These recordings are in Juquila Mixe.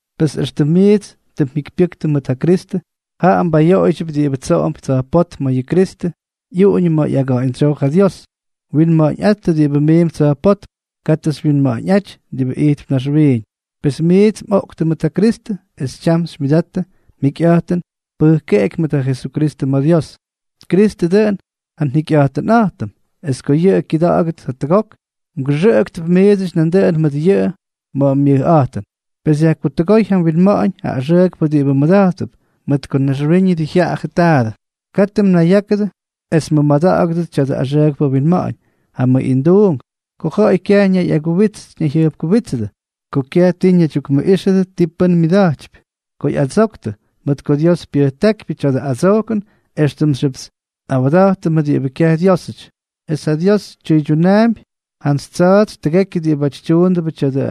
Pes éxtʉm miits tʉ mjikypyʉktʉ mʉt ja Kristʉ, jaꞌa mbayoꞌoydyʉp diꞌibʉ tsoꞌomp tsa̱jpótm, ma̱ yʉ Kristʉ ꞌyuꞌuñʉ ma̱ ꞌyaga̱ꞌa̱ñdsyoo ja Dios. Winma̱ꞌa̱ñꞌáttʉ diꞌibáty miimp tsa̱jpótm, katʉ xywyinma̱ꞌa̱ñꞌáty diꞌibʉ ijtp naxwiiñ. Pes miits mꞌoꞌktʉ mʉt ja Kristʉ, es tyam xymyʉdattʉ mjikyꞌa̱jtʉn pʉjkeꞌeky mʉt ja Jesukristʉ ma̱ Dios. Kristʉ dʉꞌʉn ja njikyꞌa̱jtʉnꞌa̱jtʉm. Es ko yʉꞌʉ kyʉda̱ꞌa̱gʉt jatʉgok, mgʉxʉꞌʉktʉp miidsʉty nandʉꞌʉn mʉt yʉꞌʉ ma̱ ja myʉjꞌa̱jtʉn. Pes yajkutʉgóy ja mwinma̱ꞌa̱ñ ja axʉʉkpʉ diꞌibʉ mmʉda̱jttʉp, mʉt ko naxwiiñʉdʉ jyaꞌajʉ taadʉ. Katʉ mnayyákʉdʉ es mmʉmada̱ꞌa̱gʉdʉt tya̱dʉ axʉʉkpʉ winma̱ꞌa̱ñ: ja mʉꞌinduunk, ko ja̱ꞌa̱y kyaj ñayꞌaguwits ñayjyʉjpkuwítsʉdʉ, ko kyaj ti ñaydyukmʉꞌíxʉdʉ ti pʉ́n myʉda̱jtypy, ko ꞌyadsoktʉ, mʉt ko Dios pyʉjtákypyʉ tya̱dʉ adsojkʉn éxtʉmxyʉp nꞌawda̱jtʉmʉ diꞌibʉ kyaj Dyiósʉty, es ja Dios tyʉydyunaampy jantsy tsa̱a̱tsy tʉgekyʉ diꞌibáty tyuundʉbʉ tya̱dʉ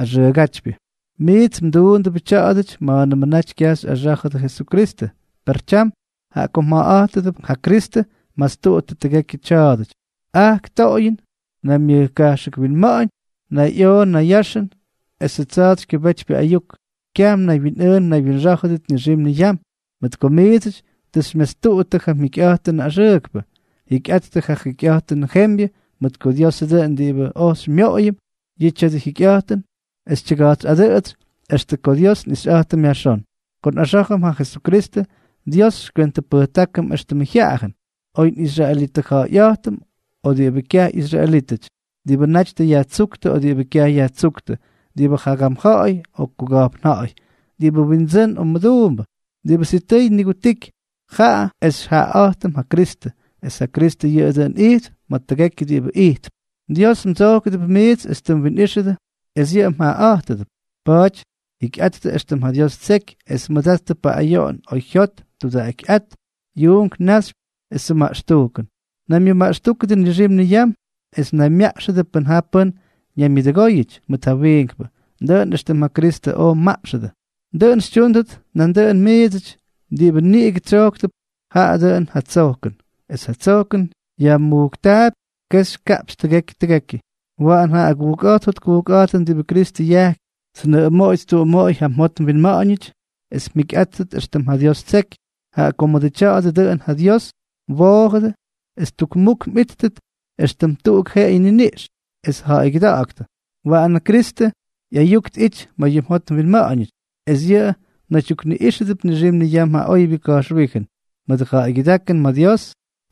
axʉʉgátypyʉ. Miits mduundʉ tya̱a̱dʉty ma̱a̱nʉmʉ naty kyaj xyꞌaxá̱jʉdʉ Jesukristʉ. Per tyam, jaꞌa ko mjaꞌaꞌa̱jtʉdʉp ja Kristʉ, mastuꞌuttʉ tʉgekyʉ tya̱a̱dʉty: ajk toꞌoyʉn, naymyʉjkajxʉk winma̱ꞌa̱ñ, nayꞌoꞌo nayyaxʉn esʉ tsa̱a̱tsykyʉbétypyʉ ayuk. Kyaj mnaywyinꞌʉʉn mnaywyinxá̱jʉdʉt nixim niyam, mʉt ko miidsʉty tʉ xymyastuꞌuttʉ ja mjekyjyikyꞌa̱jtʉnʉ axʉʉkpʉ. Jikyꞌattʉ ja jikyꞌa̱jtʉnʉ jembyʉ, mʉt ko Diosʉ dʉꞌʉn diꞌibʉ oj xymyoꞌoyʉm yʉ tya̱dʉ jikyꞌa̱jtʉn es tyʉga̱jtsꞌadʉꞌʉtsy extʉ ko Dios nꞌixyꞌa̱jtʉm yajxón. Ko nꞌaxá̱jʉm ja Jesukristʉ, Dios xykywentʉpʉjtákʉm éxtʉmʉ jyaꞌayʉn, oy nꞌisraelitʉja̱ꞌa̱yꞌa̱jtʉm o diꞌibʉ kyaj ꞌyisraelítʉty, diꞌibʉ naty tʉ yajtsúktʉ o diꞌibʉ kyaj yajtsúktʉ, diꞌibʉ jagam ja̱ꞌa̱y o kuka̱jpn ja̱ꞌa̱y, diꞌibʉ windsʉ́n o mʉduumbʉ. Diꞌibʉ sitʉy nigutiky, jaꞌa es xyjaꞌaꞌa̱jtʉm ja Kristʉ, es ja Kristʉ yʉꞌʉ dʉꞌʉn ijtp ma̱ tʉgekyʉ diꞌibʉ ijtp. Dios mdsojkʉdʉp miits es tʉ mwinꞌíxʉdʉ es yʉꞌʉ mjaꞌaꞌátʉdʉp. Pa̱a̱ty jikyꞌattʉ éxtʉm ja Dios ttseky, es mʉdattʉ paꞌꞌayoꞌon, oyjyot, tudaꞌakyꞌát, yuunk naxypy esʉ maꞌxtujkʉn. Naymyʉmaꞌxtúkʉdʉ nixim niyam es naymyaꞌxʉdʉ pʉn ja pʉ́n ñaymyʉdʉgóyʉty mʉt ja wiinkpʉ. Dʉꞌʉn éxtʉm ja Kristʉ oj mmaꞌxʉdʉ, dʉꞌʉn xytyúndʉt nandʉꞌʉn miidsʉty. Diꞌibʉ niꞌigʉ tsojkʉp, jaꞌa dʉꞌʉn ja tsojkʉn, es ja tsojkʉn yajmujktaapy kexy kaꞌpxy tʉgekyʉ tʉgekyʉ. Waꞌan ja agujkꞌa̱jt jotkujkꞌa̱jtʉn diꞌibʉ Kristʉ yajkypy, tnʉꞌʉmoꞌoy ttuꞌumoꞌoy ja mjot mwinma̱ꞌa̱ñʉty es mjikyꞌáttʉt éxtʉm ja Dios ttseky. Jaꞌa ko mʉdʉ tya̱a̱dʉ dʉꞌʉn ja Dios mwoojʉdʉ es tukmuk mꞌíttʉt, éxtʉm tuꞌuk jeꞌeyʉ niniꞌx. Es ja̱ꞌa̱ygyʉda̱ꞌa̱ktʉ. Waꞌan ja Kristʉ ꞌyayuk tꞌity ma̱ yʉ mjot mwinma̱ꞌa̱ñʉty, es yʉꞌʉ mnaydyukniꞌíxʉdʉp nixim niyam ja oybyʉ ka̱jxwíjʉn. Mʉdʉ ja̱ꞌa̱ygyʉdákʉn ma̱ Dios,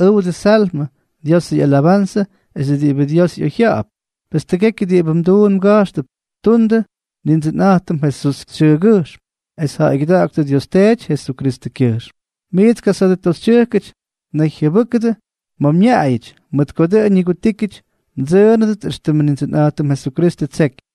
ʉwdʉ Salmʉ, Diosʉ ꞌyalabanzʉ, es diꞌibʉ Dios ꞌyoyjya̱ꞌa̱p. Pes tʉgekyʉ diꞌibʉ mduun mga̱jxtʉp, tundʉ Nindsʉnꞌa̱jtʉm Jesús xyʉʉgyʉjxm, es ja̱ꞌa̱ygyʉda̱ꞌa̱ktʉ Dios Teety Jesukristʉkyʉjxm. Miits kasa̱a̱dʉ toxytyʉjkʉty, naygyʉbʉ́kʉdʉ ma̱ mñaꞌayʉty, mʉt ko dʉꞌʉn ñigutíkyʉty mdsʉʉnʉdʉt éxtʉmʉ Nindsʉnꞌa̱jtʉm Jesukristʉ ttseky.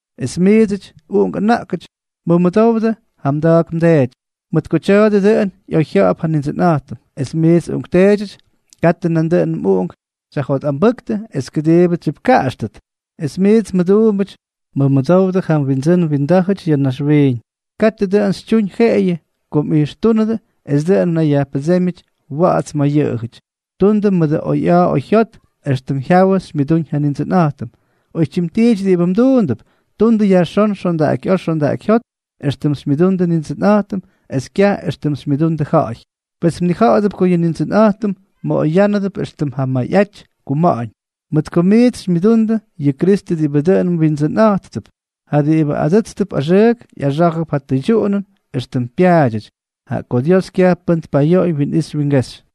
Es miidsʉty uꞌunk ʉna̱ꞌkʉty, mʉmʉdowdʉ ja mda̱a̱k mdeety, mʉt ko tya̱a̱dʉ dʉꞌʉn ꞌyoyjya̱ꞌa̱p ja Nindsʉnꞌa̱jtʉm. Es miits uꞌunkteedyʉty, katʉ nandʉꞌʉnʉ mꞌuꞌunk xyajjotꞌambʉ́ktʉ es kʉdiibʉ tsyipkaꞌaxtʉt. Es miits mʉduumbʉty, mʉmʉdowdʉ ja mwindsʉ́n mwindá̱jʉty ya̱ naxwiiñ. Katʉ dʉꞌʉn xytyuñ jeꞌeyʉ ko mꞌijxtúnʉdʉ es dʉꞌʉn mnayyajpʉdsémyʉty wa̱ꞌa̱ts mʉt yʉꞌʉjʉty, tundʉ mʉdʉ oyꞌa̱a̱ oyjyot, éxtʉm jyawʉ xymyʉdúñ ja Nindsʉnꞌa̱jtʉm. Oytyim tiity diꞌibʉ mduundʉp, tundʉ yajxón xondaꞌakyꞌa̱a̱ xondaꞌakyjyót, éxtʉm xymyʉdundʉ Nindsʉnꞌa̱jtʉm es kyaj éxtʉm xymyʉdundʉ ja̱ꞌa̱y. Pes mnija̱ꞌa̱dʉp ko yʉ Nindsʉnꞌa̱jtʉm mmoꞌoyánʉdʉp éxtʉm ja mayꞌaty ja kuma̱ꞌa̱ñ, mʉt ko miits xymyʉdundʉ yʉ Kristʉ diꞌibʉ dʉn mWindsʉnꞌa̱jttʉp. Ja diꞌibʉ adʉ́tstʉp axʉʉk, ꞌyaxá̱jʉp ja tʉydyuꞌunʉn éxtʉm pyaadyʉty, jaꞌa ko Dios kyaj pʉ́n tpayoꞌoy winꞌixy wingexy.